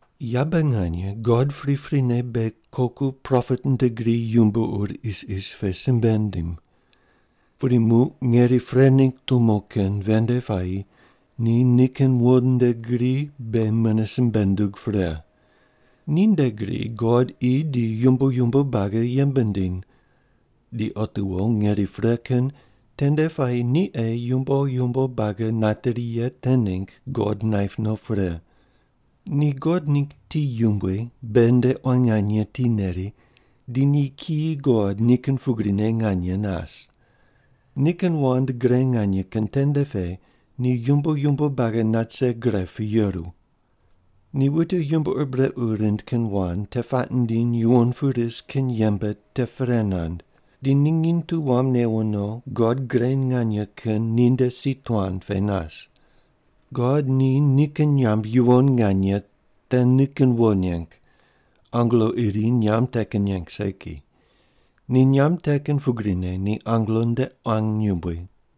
Yabe nganye God priprine beghi koku propet nde gri yumbo ur isis pe simbe nindim. Pudi muq ngeri pre ningg tumo kin ven nde puayi ni nikin wo nde gri beghi mune simbe nundug pre. Ni nde gri God qi di yumbo yumbo buagi yembe nindiny. Di otiwo ngeri pre kin tende puayi ni ei yumbo yumbo buagi nateri ye te ningg God naip no pre. Ni God ningg ti yumbui beghi nde quan nganye ti neri di ni kiyi God ni kin pugrine nganye nas. Nikin wand gre nganye kin tende pe ni yumbo yumbo buagi nat rise gre pu yeru. Ni wute yumbo ur brequ rind kin wand te puaq nindiny yuwon pu ris kin yembe te pre nand, di ni nginy tu wam newo no God Gre Nganye Kin ninde si tuan pe nas. God ni nikin nyamb yuwon nganye te nikin wo neng, angelo iri nyamb te kin neng segi. Ni nyamb te kin pugrine ni angelo nde quan yumbui.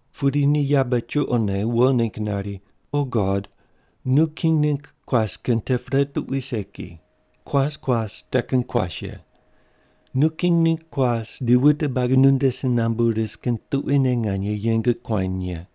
Pudi ni yabe chuqone wo ningg nari, O God, nu king ningg kuas kin te pre tuqui segi, kuas kuas te kin kuas ye. Nu king ningg kuas di wute buagi nunde si nambu ris kin tuquine nganye yeng kuany ye.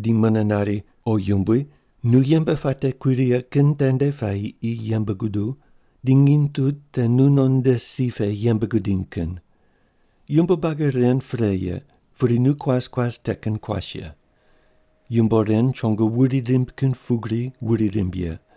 Di mune nari, O Yumbui, nu yembe puate kui righe kin tende puayi qi yembe guduw, di nginy tu te nu non nde si pe yembe gudiny kin. Yumbo buagi ren pre ye, pudi nu kuas kuas te kin kuas ye. Yumbo ren chongo wuri rimb kin pugri wuri rimb ye.